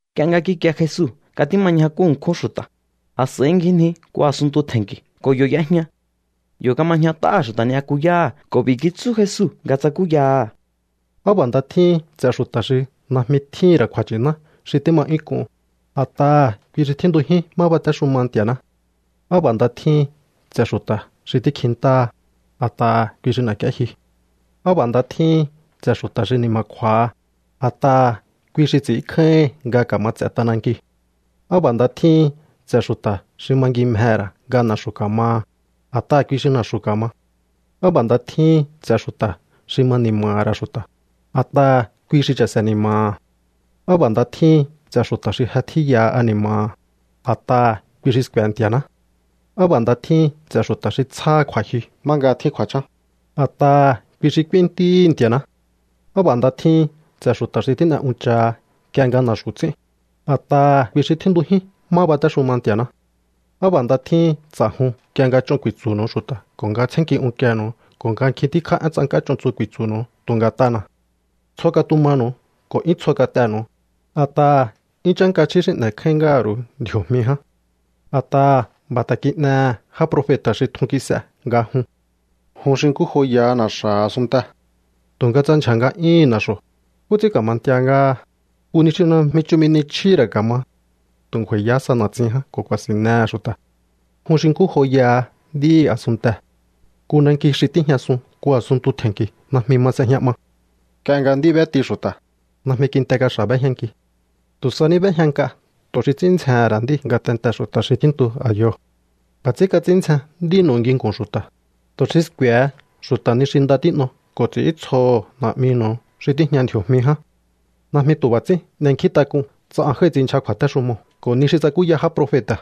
Nk'ie nga kikie Jesu nga tíma ñjakú ṉkjún xu̱ta̱, a̱s'a̱i ngjinji nku a̱sunntu tje̱nki̱ ko̱ yo̱ y'ejña. Yo̱ kama ñjat'áha̱ xu̱ta̱ ni'yakuyáha̱, ko̱ b'i̱ kitsú Jesu nga tsakúyaha̱: —Á b'a̱ nda tjíhin ts'e̱ xu̱ta̱ xi najmi tjíhi̱n ra̱ kju̱a̱nchi̱ná xi tíma 'yún k'un, a̱t'aha̱ kui xi tjíntujín má batéxuma Nti̱a̱ná. ’Á b'a̱ nda tjíhin ts'e̱ xu̱ta̱ xi tíkjintáha, a̱t'aha̱ kui xi n'e̱k'íéjyu. ’Á b'a̱ nda tjíhin ts'e̱ xu̱ta̱ xi ni̱ma̱kju̱a̱ha, a̱t'aha̱ kui xi ts'i̱ínkjáíhi̱n nga ka̱ma ts'e̱ t'anankiu̱. ’Á b'a̱ nda tjíhin ts'e̱ xu̱ta̱ xi mangimjehe̱ ra̱ nga na̱xu̱ ka̱maha, a̱t'aha̱ kui xi na̱xu̱ ka̱ma. ’Á b'a̱ nda tjíhin ts'e̱ xu̱ta̱ xi ma ni̱ma̱ha̱ ra̱ xu̱ta̱, a̱t'aha̱ kui xi cha̱se̱ ni̱ma̱ha̱. ’Á b'a̱ nda tjíhin ts'e̱ xu̱ta̱ xi je tjíyaha ani̱ma̱ha̱, a̱t'aha̱ kui xi sku̱e̱ Nti̱a̱ná. ’Á b'a̱ nda tjíhin ts'e̱ xu̱ta̱ xi tsjáha kju̱a̱jyu má nga tjín kju̱a̱chán, a̱t'aha̱ kui xi k'úín ntíhi̱ Nti̱a̱ná. ’Á b'a̱ nda tjíhin ts'e̱ xu̱ta̱ xi tín'e unchaha nk'ie nga na̱xu̱ ts'ín, a̱t'aha̱ kui xi tjíntujín má batéxuma Nti̱a̱ná. ’Á b'a̱ nda tjíhin ts'a̱jun nk'ie nga ch'on ku̱i̱tsu̱nu̱u xu̱ta̱ ko̱ nga tsjénnki unkienu̱u ko̱ nga nkjin tíkjá én tsank'á ch'on tsu ku̱i̱tsu̱nu̱u tu̱ nga̱t'ana̱. Tsjo katumanu̱u ko̱ 'yún tsjo kat'enu̱u, a̱t'aha̱ 'yún chánka chjí xi n'e̱kjáín ngáha̱ ru̱u ndji̱o̱jmi ján. A̱t'aha̱ b'a̱ ta̱ kin'ehe̱ já profeta̱ xi tjun kis'e nga jun. ’Jun xi nkú joyaha na̱xa̱ha̱ a̱sunntee̱. Tu̱nga tsa ndyja̱ nga'yúhu̱n na̱xo̱, ¿nkú ts'ín ka̱ma ntia ngáha? Nku ni xi najmi chumi ni chjíhi̱ ra̱ ka̱ma. Tu̱ ngju̱a̱i̱yahá sa na̱tsin ján ko̱ ku̱a̱si̱nnehe̱ xu̱ta̱. ’Jun xi nkú joyaha nd'íhi̱ a̱sunntee̱. Nku nanki xi tíjñasun nku a̱sunntu tje̱nki̱ najmi ma s'ejña 'ma. Nk'ie nga nd'í b'éti xu̱ta̱, najmi kinte kaxa̱ b'éjñanki. Tu̱ sa ní b'éjña nk'a tu̱ xi ts'ín ndzjehe̱n ra̱ nd'íu̱ ngatentee̱ xu̱ta̱ xi tjíntu a̱yoo̱. B'a̱ ts'ín kats'ín ndzjen nd'ínu̱u nginku̱n xu̱ta̱, tu̱ xi sku̱e̱he xu̱ta̱ ni xi nda tín'o ko̱ ts'i̱íntsjoho̱ Na̱'minu̱u xi tíjña ndji̱o̱jmi ján. ’Najmi tu̱ b'a̱ ts'ín n'enkjíntak'un tsa an jái̱ ts'inndyja kju̱a̱téxumoo̱ ko̱ ni xi tsakúya já profeta̱.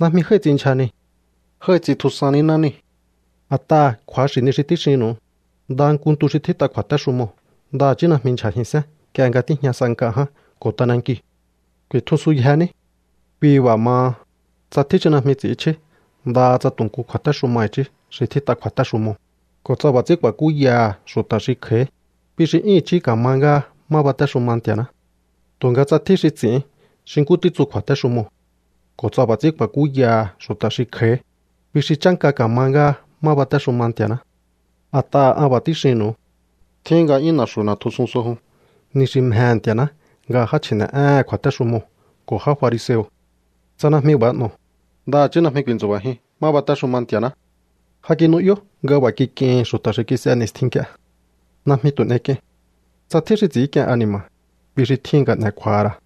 Najmi jái̱ ts'inndyja niu̱. Jái̱ ts'intjusan níná niu̱. A̱t'aha̱ kju̱axi̱ ni xi tíxinnu̱u. Ndaha nku ntu xi tjít'a kju̱a̱téxumoo̱ ndaha̱chí najmi ndyja̱jihi̱nsén nk'ie nga tíjña sa nk'a ján ko̱ t'anankiu̱. Ku̱i̱tjusunyje ní. ’Kui b'a̱ maha, tsa tjín xi najmi ts'i̱ínchjí ndaha tsa tu̱ nku kju̱a̱téxuma i̱chí xi tjít'a kju̱a̱téxumoo̱, ko̱ tsa b'a̱ ts'ín ku̱a̱kúyaha̱ xu̱ta̱ xi kj'a̱í, kui xi 'yún i̱chí ka̱ma ngáha má batéxuma Nti̱a̱ná. Tu̱nga tsa tjín xi ts'i̱ín xi nkú títsu kju̱a̱téxumoo̱, ko̱ tsa b'a̱ ts'ín ku̱a̱kúyaha̱ xu̱ta̱ xi kj'a̱í, kui xi chánka ka̱ma ngáha má batéxuma Nti̱a̱ná. A̱t'aha̱ an b'a̱ tíxinnu̱u. Tjíhin nga 'yún na̱xu̱ n'e̱tjusun so jun ni xi mjehe̱ Nti̱a̱ná nga já chji̱ne̱'éhe̱n kju̱a̱téxumoo̱ ko̱ já fariseo̱. Tsa najmi b'a̱ n'o̱o, ndaha̱chí najmi ku̱i̱ntsu̱ba̱jiun má batéxuma Nti̱a̱ná. ’Ja kinu'yó nga b'a̱ kik'ihi̱n xu̱ta̱ xi kis'e ni̱stjin nk'ie: “Najmi tu̱ n'ek'iein. Tsa tjín xi ts'i̱ínk'ien ani̱ma̱, kui xi tjíhin nga n'e̱ kju̱a̱ha̱ ra̱.”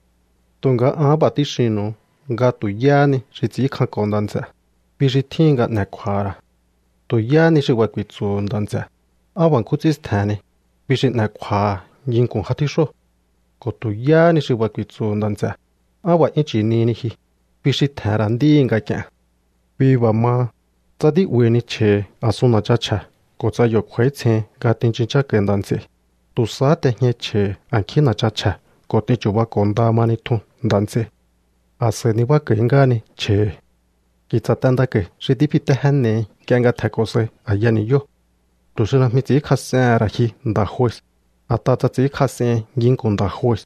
Tu̱nga an b'a̱ tíxinnu̱u nga tu̱ yáhá ni xi ts'i̱ínkjanko̱ nda̱ nts'e̱, kui xi tjíhin nga n'e̱ kju̱a̱ha̱ ra̱. Tu̱ yáhá ni xi b'a̱ ku̱i̱tsu̱hu̱ nda̱ nts'e̱: “Á b'a̱ nkjún ts'ín stje̱henni”, kui xi n'e̱ kju̱a̱ha̱ nginku̱n já tjíxóo̱. Ko̱ tu̱ yáhá ni xi b'a̱ ku̱i̱tsu̱hu̱ nda̱ nts'e̱: “Á b'a̱ 'yún chi̱nihini ji”, kui xi tje̱he̱n ra̱ nd'íhi̱ nga̱k'i̱e̱n. ’Kui b'a̱ maha, tsa tí'ba̱i̱hini chje̱hi̱ a̱sun na̱chan chje̱ ko̱ tsa yo̱ kj'u̱a̱ítsjein nga tinchun chánko̱i̱ nda̱ nts'ei, tu̱ sahá t'ejñai chje̱hi̱ a̱nkjín na̱chan chje̱ ko̱ t'in chu̱bako̱ nda mahi tjun nda̱ nts'ei. A̱s'a̱i nibák'a̱i̱ ngáhani chje̱hi̱. ’Ki̱tsa̱ t'endako̱i̱ xi tífitéjénehi nk'ie nga tje̱nko̱ sai a̱ya ni̱yóo̱, tu̱ xi najmi ts'i̱ínkjas'ehe̱n ra̱ ji nda̱ jue. A̱t'aha̱ tsa ts'i̱ínkjas'ehin nginku̱n nda̱ jue,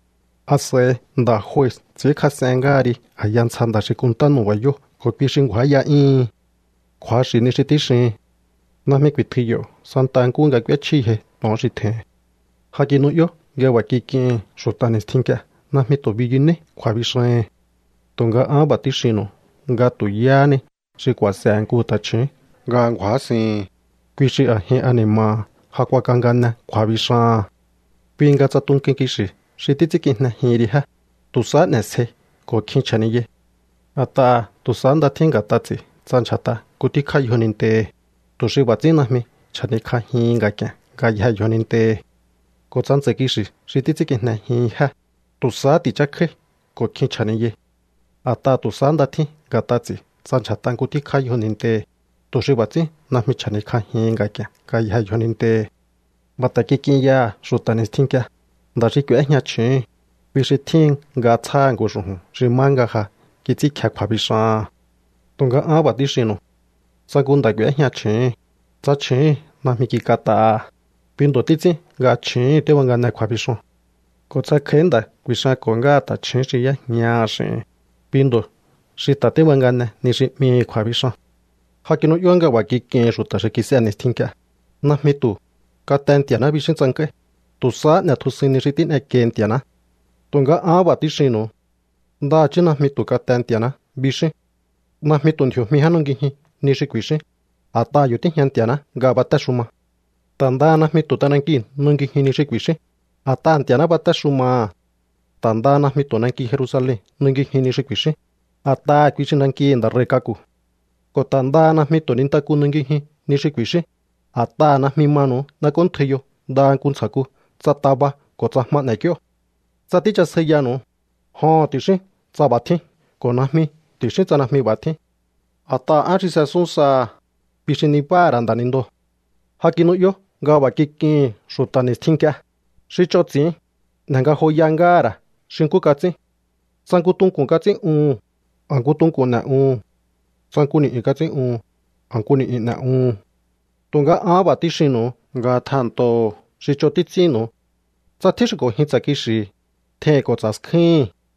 a̱s'a̱i nda̱ jue ts'i̱ínkjas'en ngáha ri a̱ya ntsja nda̱ xi kunnta nu̱ba̱yóo̱ ko̱ kui xi ngju̱áya'yíhin. Kju̱axi̱ ni xi tíxihin. Najmi ku̱i̱tjui yo̱ santa nkúhu nga k'úéchjíyjei to̱on xi tje̱hin. ’Ja kinu'yó nga b'a̱ kik'ihi̱n xu̱ta̱ ni̱stjin nk'ie: “Najmi tu̱ biyunéí kju̱a̱bixahi̱n.” Tu̱nga an b'a̱ tíxinnu̱u nga tu̱ yáhá ni xi ku̱a̱se̱he̱ nku ta̱chju̱ún nga ngju̱ásihi̱n, kui xi a̱jin ani̱ma̱ha̱ ja kuakangane kju̱a̱bixaha̱n. ’Kui nga tsa tunkuin kixi̱ xi títs'ínkijnejihin ri jé, tu̱ sahá n'e̱sjei ko̱ kjin chja̱niyai. A̱t'aha̱ tu̱ sahá nda tjín nga̱t'a ts'i̱ tsa ndyja̱t'a nku tíkjá yjonintehi̱, tu̱ xi b'a̱ ts'ín najmi chja̱nikj'ajihin nga̱k'i̱e̱n ngayjee̱ yjonintehi̱. Ko̱ tsa ntsa̱i̱ kixi̱ xi títs'ínkijnejihin jé, tu̱ sahá ti̱chákjáí ko̱ kjin chja̱niyai. A̱t'aha̱ tu̱ sahá nda tjín nga̱t'a ts'i̱ tsa ndyja̱t'a nku tíkjá yjonintehi̱, tu̱ xi b'a̱ ts'ín najmi chja̱nikj'ajihin nga̱k'i̱e̱n ngayjee̱ yjonintehi̱. ’B'a̱ ta̱ kik'in yaha̱ xu̱ta̱ ni̱stjin nk'ie: “Nda̱ xi k'u̱éjña chju̱úhu̱n, kui xi tjíhin nga tsjáha̱ nku xu̱ju̱n xi má nga ja kits'ínkje kju̱a̱bixaha̱n.” Tu̱nga an b'a̱ tíxinnu̱u. Tsa nku nda̱ k'u̱éjña chju̱úhu̱n, tsa chju̱úhu̱n najmi kik'at'aha̱, kui ndo̱ títs'ín nga chju̱úhu̱n tíbangane kju̱a̱bixoo̱n. Ko̱ tsa kj'a̱í nda̱ ku̱i̱xanko̱ ngáha ta̱chju̱ún xi y'éjñaha̱ x'i̱hi̱n, kui ndo̱ xi ta̱ tíbangane ni xi 'mihi̱ kju̱a̱bixan. ’Ja kinu'yó nga b'a̱ kik'ihi̱n xu̱ta̱ xi kis'e ni̱stjin nk'ie: “Najmi tu̱: Kate Nti̱a̱ná, bixín tsank'áí. Tu̱ sahá n'e̱tjusuin ni xi tín'ekiei Nti̱a̱ná.” Tu̱nga ahán b'a̱ tíxinnu̱u. Ndaha̱chí najmi tu̱ “kate Nti̱a̱ná” bixíún. Najmi tu̱ ndji̱o̱jmi ján nungijiun ni xi ku̱i̱xíún, a̱t'aha̱ yo̱ tíjña Nti̱a̱ná nga batéxuma. Ta̱ ndaha najmi tu̱ t'anankiu̱ nungijiun ni xi ku̱i̱xíún, a̱t'aha̱ Nti̱a̱ná batéxumaha̱. Ta̱ ndaha najmi tu̱ nanki Jerusalen nungijiun ni xi ku̱i̱xíún, a̱t'aha̱ kui xi nankihi̱ Nda̱ Rei̱ k'aku̱. ’Ko̱ ta̱ ndaha najmi tu̱ nintaku nungijiun ni xi ku̱i̱xíún, a̱t'aha̱ najmi manu̱u n'ek'óntjaiyo ndaha nku ntsja̱ku tsa taba ko̱ tsa jma n'ek'íó. Tsa tíchasjaiyanu̱u, “joho̱n” ti̱xíún tsa b'a̱ tjín ko̱ “najmi” ti̱xíún tsa najmi b'a̱ tjín. A̱t'aha̱ én xi s'esun saha̱, kui xi nibáha̱ ra̱ nda̱nindoo̱. ’Ja kinu'yó nga b'a̱ kik'ihi̱n xu̱ta̱ ni̱stjin nk'ie: “Xi ch'on ts'i̱ín, n'e̱ ngajoya ngáha̱ ra̱ xi nkú kats'ín. Tsa nku tunku̱n kats'ín'uhu̱n, a̱ nku tunku̱n n'e̱'uhu̱n. Tsa nku ni̱'yu̱n kats'ín'uhu̱n, a̱ nku ni̱'yu̱n n'e̱'uhu̱n.” Tu̱nga ahán b'a̱ tíxinnu̱u nga tjehe̱nntoho̱o xi ch'on títs'ínnu̱u. Tsa tjín xi k'o̱njin tsa̱ kixi̱hi̱, tjeihi̱n ko̱ tsa̱ skjúhi̱n.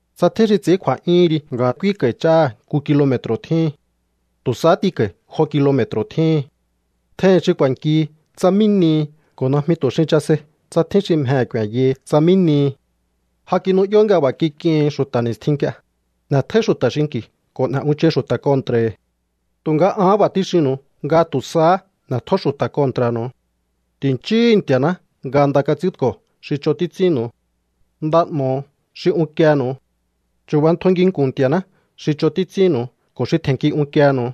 Tsa tjín xi ts'i̱ín kju̱a̱'yúhun ri nga k'úínko̱i̱ ch'áha̱ nku kilome̱tru̱ tjíhin, tu̱ sahá t'inko̱i̱ jo kilome̱tru̱ tjíhin. Tjeihi̱n xi ku̱a̱nkihi tsa mí nihi ko̱ najmi tu̱ xin chasei tsa tjín xi mjehe̱ ku̱e̱nyahi tsa mí nihi. ’Ja kinu'yó nga b'a̱ kik'ihi̱n xu̱ta̱ ni̱stjin nk'ie: “N'e̱tjóí xu̱ta̱ xinki̱ ko̱ n'e̱ unchai xu̱ta̱ kontra̱hi̱.” Tu̱nga ahán b'a̱ tíxinnu̱u nga tu̱ sahá n'e̱tjó xu̱ta̱ kontra̱nu̱u. Ti̱nchíhu̱u Nti̱a̱ná nga nda kats'ínko̱ xi ch'on títsunu̱u. Nda n'o̱ho̱o xi unkienu̱u. Chu̱bantjo nginku̱n Nti̱a̱ná xi ch'on títs'ínnu̱u ko̱ xi tje̱nnki unkienu̱u.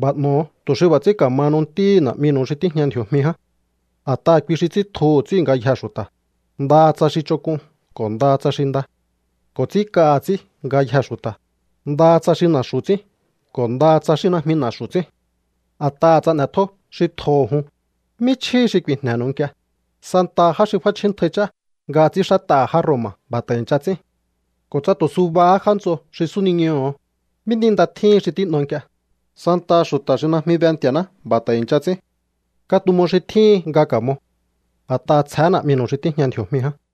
’B'a̱ n'o̱o tu̱ xi b'a̱ ts'ín ka̱mahanu ntíhi̱ Na̱'minu̱u xi tíjña ndji̱o̱jmi ján. A̱t'aha̱ kui xi ts'íntjuhu̱ ts'íu̱ ngayjee̱ xu̱ta̱, ndaha tsa xi ch'onk'un ko̱ ndaha tsa xi nda. Ko̱ ts'ínk'aha̱ ts'í ngayjee̱ xu̱ta̱, ndaha tsa xi na̱xu̱ ts'ín ko̱ ndaha tsa xi najmi na̱xu̱ ts'ín. A̱t'aha̱ tsa n'e̱tjó xi tjoho̱ jun, ¿mí chjíhi xi ku̱i̱jne̱nu̱u nk'ie? Santaha já xi f'áchjíntjai ch'á nga ts'ínxát'aha̱ já Roma̱ b'a̱ ta̱ i̱ncha ts'ín. Ko̱ tsa tu̱ subahá já nts'o xi súniñoho̱o, ¿mí ni nda tjíhin xi tín'o nk'ie? Santaha xu̱ta̱ xi najmi be Nti̱a̱ná b'a̱ ta̱ i̱ncha ts'ín. Katumo xi tjíhin nga ka̱mo. A̱t'aha̱ tsjehé Na̱'minu̱u xi tíjña ndji̱o̱jmi ján.